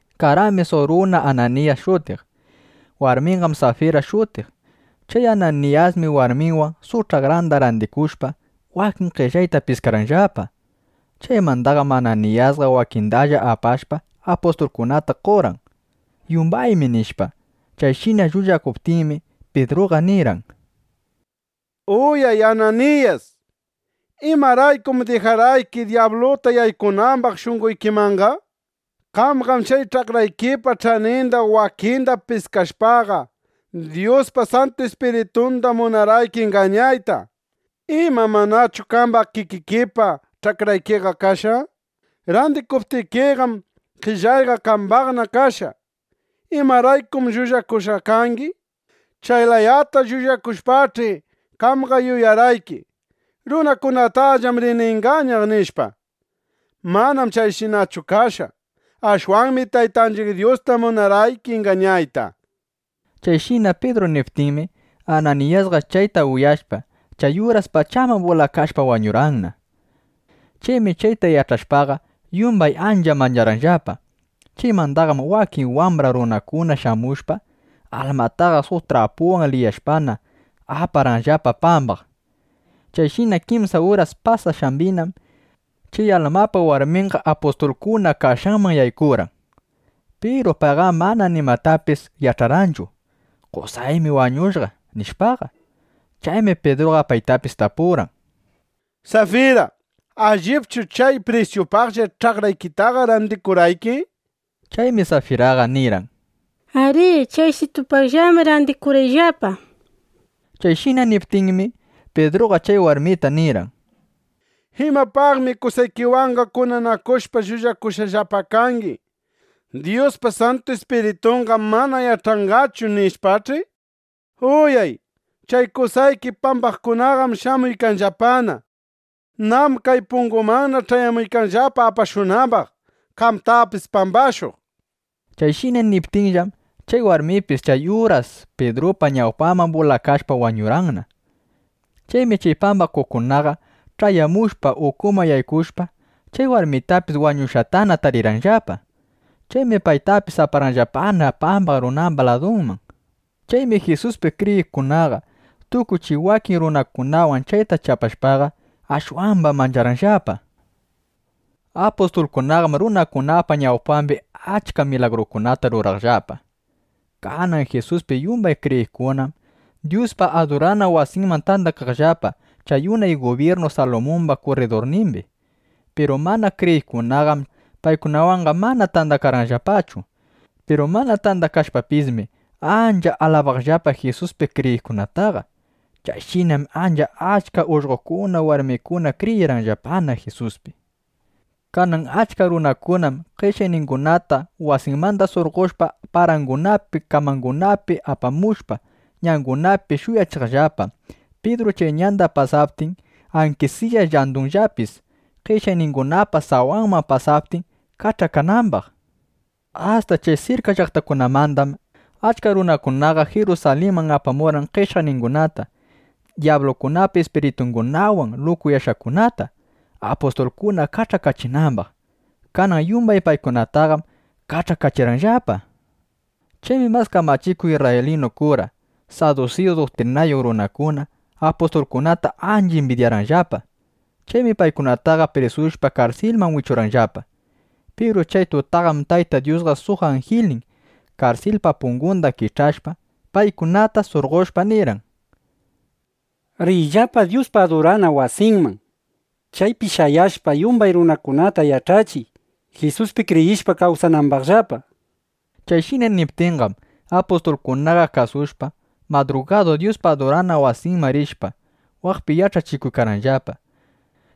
Karqanmi suq runa Ananiyas shutiq. Warminqam Safira shutiq. Chay Ananiyasmi warminwan, suq ch'akranda randikushpa, wakin qellayta piskarqanllapa. Chaymandaqam Ananiyasqa wakindalla apashpa, apustulkunata qorqan, “Yumbaymi” nishpa. Chayshina llullakuptinmi, Pidruqa nirqan: —Uyay, Ananiyas. ¿Imaraykum dijarqayki dyabluta yaykunambaq shunqoykimanqa? Qamqam chay ch'akraykipa ch'aninda wakinda piskashpaqa, Dyuspa Santu Ispiritunda munarqayki ingañayta. ¿Ima manachu qamba kikikipa ch'akraykiqa kashqa? Randikuptikiqam, qellayqa qambana kashqa. ¿Imaraykum llullakushqaqa kangi? Chay layata llullakushpaqach'i, qamqa yuyarqayki: Runakunatallam rini ingañaq, nishpa. Manam chayshinachu kashqa. Ashwanmi Taytanchiq Dyusta munarqayki ingañayta. Chayshina Pidru niptinmi, Ananiyasqa chayta uyashpa, chay uras pachaman bulakashpa wañurqanna. Chaymi chayta yach'ashpaqa, yumbay ancha mancharqanllapa. Chaymandaqam wakin wambra runakuna shamushpa, almataqa suq trapuwan liyashpana, aparqanllapa pambaq. Chayshina kimsa uras pasashqambinam, chay almapa warminqa apustulkuna kashqanman yaykurqan. Piru payqam mana nimatapis yach'arqanchu: Qosaymi wañushqa, nishpaqa. Chaymi Pidruqa paytapis tapurqan: —Safira, ¿allipchu chay prisyupaqlla ch'akraykitaqa randikurqayki? nishpa. Chaymi Safiraqa nirqan: —Arí. Chaysitupaqllam randikurqayllapa, nishpa. Chayshina niptinmi, Pidruqa chay warmita nirqan: —¿Imapaqmi qosaykiwanqa kunanakushpa llullakushqallapa kangi, “Dyuspa Santu Ispiritunqam mana yach'anqachu”, nishpach'i? Uyay, chay qosaykita pambaqkunaqam shamuykanllapana. Nam kay pungumanna ch'ayamuykanllapa apashunambaq, qamtapis pambashuq, nishpa. Chayshina niptinllam, chay warmipis chay uras Pidrupa ñawpanman bulakashpa wañurqanna. Chaymi chay pambakuqkunaqa ch'ayamushpa, ukuman yaykushpa, chay warmitapis wañushqatana tarirqanllapa. Chaymi paytapis aparqanllapana pambaq runamba ladunman. Chaymi Jisuspi kriyiqkunaqa, tukuy chay wakin runakunawan chayta yach'ashpaqa, ashwamba mancharqanllapa. Apustulkunaqam runakunapa ñawpambi achka milagrukunata ruraqllapa. Kanan Jisuspi yumbay kriyiqkunam Dyuspa adurana wasinman tandakaqllapa chay unay gubyirnu Salumumba kurridurnimbi. Piru mana kriyiqkunaqam manchashpa, paykunawanqa mana tandakaqllapachu. Piru mana tandakashpapismi, ancha alabaqllapa Jisuspi kriyiqkunataqa. Chayshinam ancha achka ullqokuna, warmikuna kriyirqanllapana Jisuspi. Kanan achka runakunam qeshyaqningunata wasinmanda surqoshpa, parakunapi kamakunapi apamushpa, ñangunapi shuyachiqllapa, Pidru chay ñanda pasaptin, ankisiya llandunllapis qeshyaqningunapa sawanda pasaptin, kach'akanambaq. Asta chay sirka llaqtakunamandam achka runakunaqa Jirusalinman apamurqan qeshyaqningunata, dyablupa ispiritungunawan lukuyashqakunata, apustulkuna kach'akachinambaq. Kanan yumbay paykunataqam kach'akachirqanllapa. Chaymi mas kamachikuq isrraylinu kura, sadusiyu duktrinayuq runakuna apustulkunata ancha imbidyarqanllapa. Chaymi paykunataqa prisushpa, karsilman wichurqanllapa. Piru chay tutaqam Tayta Dyuspa suq anjilnin, karsilpa pungunda kich'ashpa, paykunata surqoshpa, nirqan: —Riyllapa Dyuspa adurana wasinman, chaypi shayashpa, yumbay runakunata yach'achiq, Jisuspi kriyishpa, kawsanambaqllapa. Chayshina niptinqam, apustulkunaqa kasushpa, madrugadu Dyuspa adurana wasinman rishpa, waqpi yach'achikurqanllapa.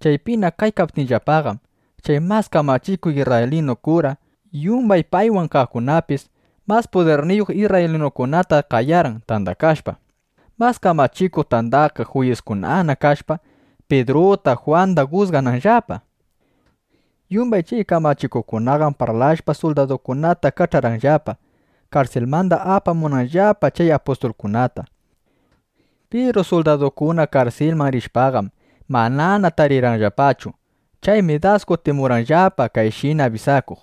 Chaypina kaykaptinllapaqam, chay mas kamachikuq isrraylinu kura, yumbay paywan kaqkunapis mas pudirniyuq isrraylinukunata qayarqan, tandakashpa, Mas Kamachikuq Tandakaq Juyiskunana kashpa, Pidruta, Jwanda jusgananllapa. Yumbay chay kamachikuqkunaqam parlashpa, suldadukunata kach'arqanllapa, karsilmanda apamunanllapa chay apustulkunata. Piru suldadukuna karsilman rishpaqam, manana tarirqanllapachu. Chaymi das kutimurqanllapa kayshina abisakuq: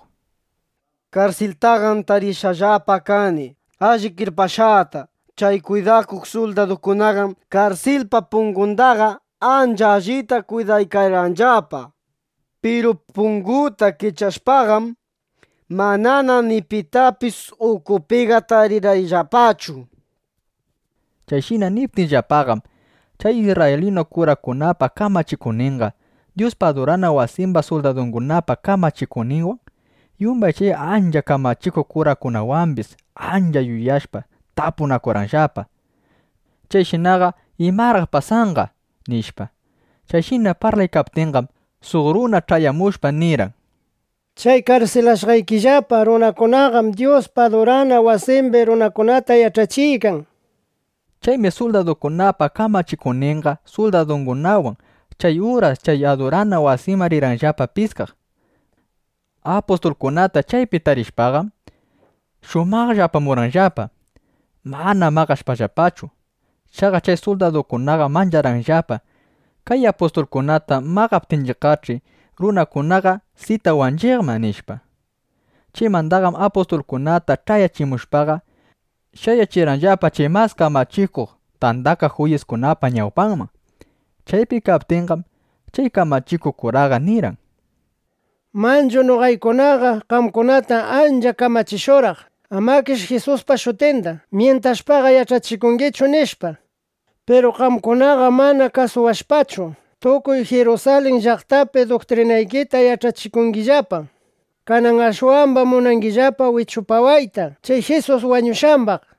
—Karsiltaqam tarishqallapa kani alli kirpashqata. Chay kwidakuq suldadukunaqam karsilpa pungundaqa ancha allita kwidaykarqanllapa. Piru punguta kich'ashpaqam, manana ni pitapis ukupiqa tarirqayllapachu, nishpa. Chayshina niptinllapaqam, chay isrraylinu kurakunapa kamachikuqninqa, Dyuspa adurana wasimba suldadungunapa kamachikuqninwan, yumbay chay ancha kamachikuq kurakunawambis ancha yuyashpa, tapunakurqanllapa: —Chayshinaqa ¿imaraq pasanqa? nishpa. Chayshina parlaykaptinqam, suq runa ch'ayamushpa, nirqan: —Chay karsilashqaykillapa runakunaqam Dyuspa adurana wasimbi runakunata yach'achiykan, nishpa. Chaymi suldadukunapa kamachikuqninqa suldadungunawan chay uras chay adurana wasiman rirqanllapa piskaq. Apustulkunata chaypi tarishpaqam, shumaqlla apamurqanllapa, mana maqashpallapachu. Chaqa chay suldadukunaqam mancharqanllapa: Kay apustulkunata maqaptinchiqqach'i, runakunaqa sitawanchiqman, nishpa. Chaymandaqam apustulkunata ch'ayachimushpaqa, shayachirqanllapa chay Mas Kamachikuq Tandakaq Juyiskunapa ñawpanman. Chaypi kaptinqam, chay kamachikuq kuraqa nirqan: —Manchu noqaykunaqa qamkunata ancha kamachishurqaq, amakish Jisuspa shutinda myintashpaqa yach'achikungichu, nishpa. Piru qamkunaqam mana kasuwashpachu, tukuy Jirusalin llaqtapi duktrinaykita yach'achikungillapa. Kanan ashwambam munangillapa wichupawayta chay Jisus wañushqambaq, nishpa.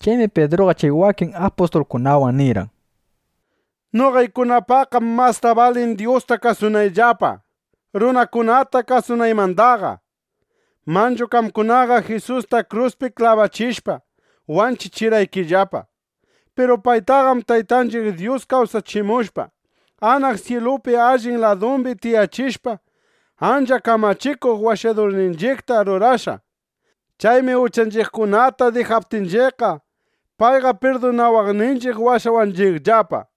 Chaymi Pidruqa chay wakin apustulkunawan nirqan: —Noqaykunapaqqam masta balin Dyusta kasunayllapa, runakunata kasunaymandaqa. Manchu qamkunaqa Jisusta kruspi klabachishpa, wanchichirqaykillapa. Piru paytaqam Taytanchiq Dyus kawsachimushpa, anaq syilupi allin ladumbi tiyachishpa, ancha Kamachikuq Washadurninchiqta rurashqa. Chaymi uchanchiqkunata dijaptinchiqqa, payqa pirdunawaqninchiq washawanchiqllapa.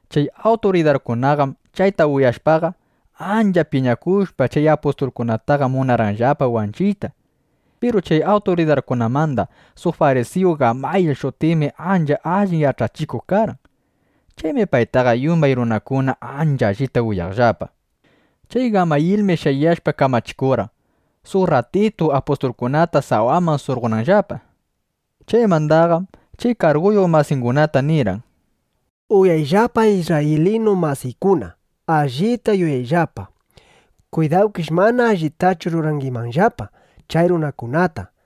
Chay awturidarkunaqam chayta uyashpaqa, ancha piñakushpa, chay apustulkunataqa munarqanllapa wanchiyta. Piru chay awturidarkunamanda suq farisiyu Gamayil shutiqmi ancha allin yach'achikuq karqan. Chaymi paytaqa yumbay runakuna ancha allita uyaqllapa. Chay Gamayilmi shayashpa kamachikurqan, suq rratitu apustulkunata sawaman surqonanllapa. Chaymandaqam chay karguyuq masingunata nirqan: —Uyawayllapa, isrraylinu masiykuna. Allita yuyayllapa. Kwidawkish mana allitachu rurangimanllapa chay runakunata.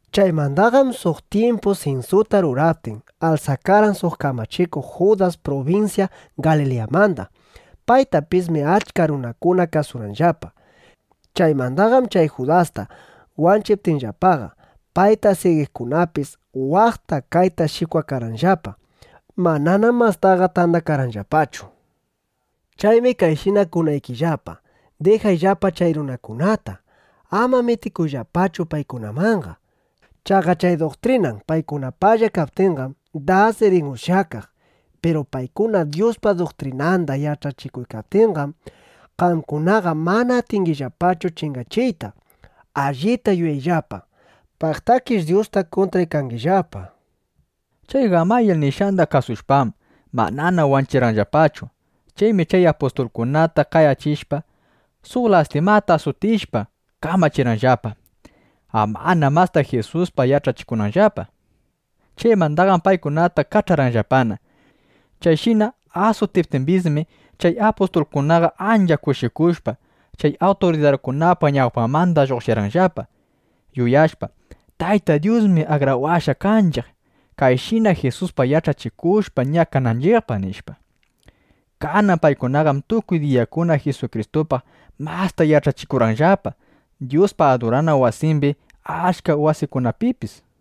Chaymandaqam suq tyimpu sinsuta ruraptin, alsakarqan suq kamachikuq Judas prubinsya Galiliyamanda. Paytapismi achka runakuna kasurqanllapa. Chaymandaqam chay Judasta wanchiptinllapaqa, payta sigiqkunapis waqta kayta shikwakarqanllapa. Mananam mastaqa tandakarqanllapachu. Chaymi kayshina kunaykillapa: Dijayllapa chay runakunata. Ama mitikuyllapachu paykunamanqa. Chaqa chay duktrinan paykunapalla kaptinqam, das rin ushyakaq. Piru paykuna Dyuspa duktrinanda yach'achikuykaptinqam, qamkunaqa mana atingillapachu chingachiyta. Allita yuyayllapa. Paqtakish Dyusta kuntraykangillapa, nishpa. Chay Gamayil nishqanda kasushpam, manana wanchirqanllapachu. Chaymi chay apustulkunata qayachishpa, suq lastima asutichishpa, kamachirqanllapa, amana masta Jisuspaq yach'achikunanllapa. Chaymandaqam paykunataqa kach'arqanllapana. Chayshina asutiptimbismi, chay apustulkunaqa ancha kushikushpa, chay awturidarkunapa ñawpanmanda lluqshirqanllapa, yuyashpa: Tayta Dyusmi akrawashqa kanchiq, kayshina Jisuspaq yach'achikushpa, ñakananchiqpaq, nishpa. Kanan paykunaqam tukuy diyakuna Jisukristupaq masta yach'achikurqanllapa Dyuspa adurana wasimbi, achka wasikunapipis.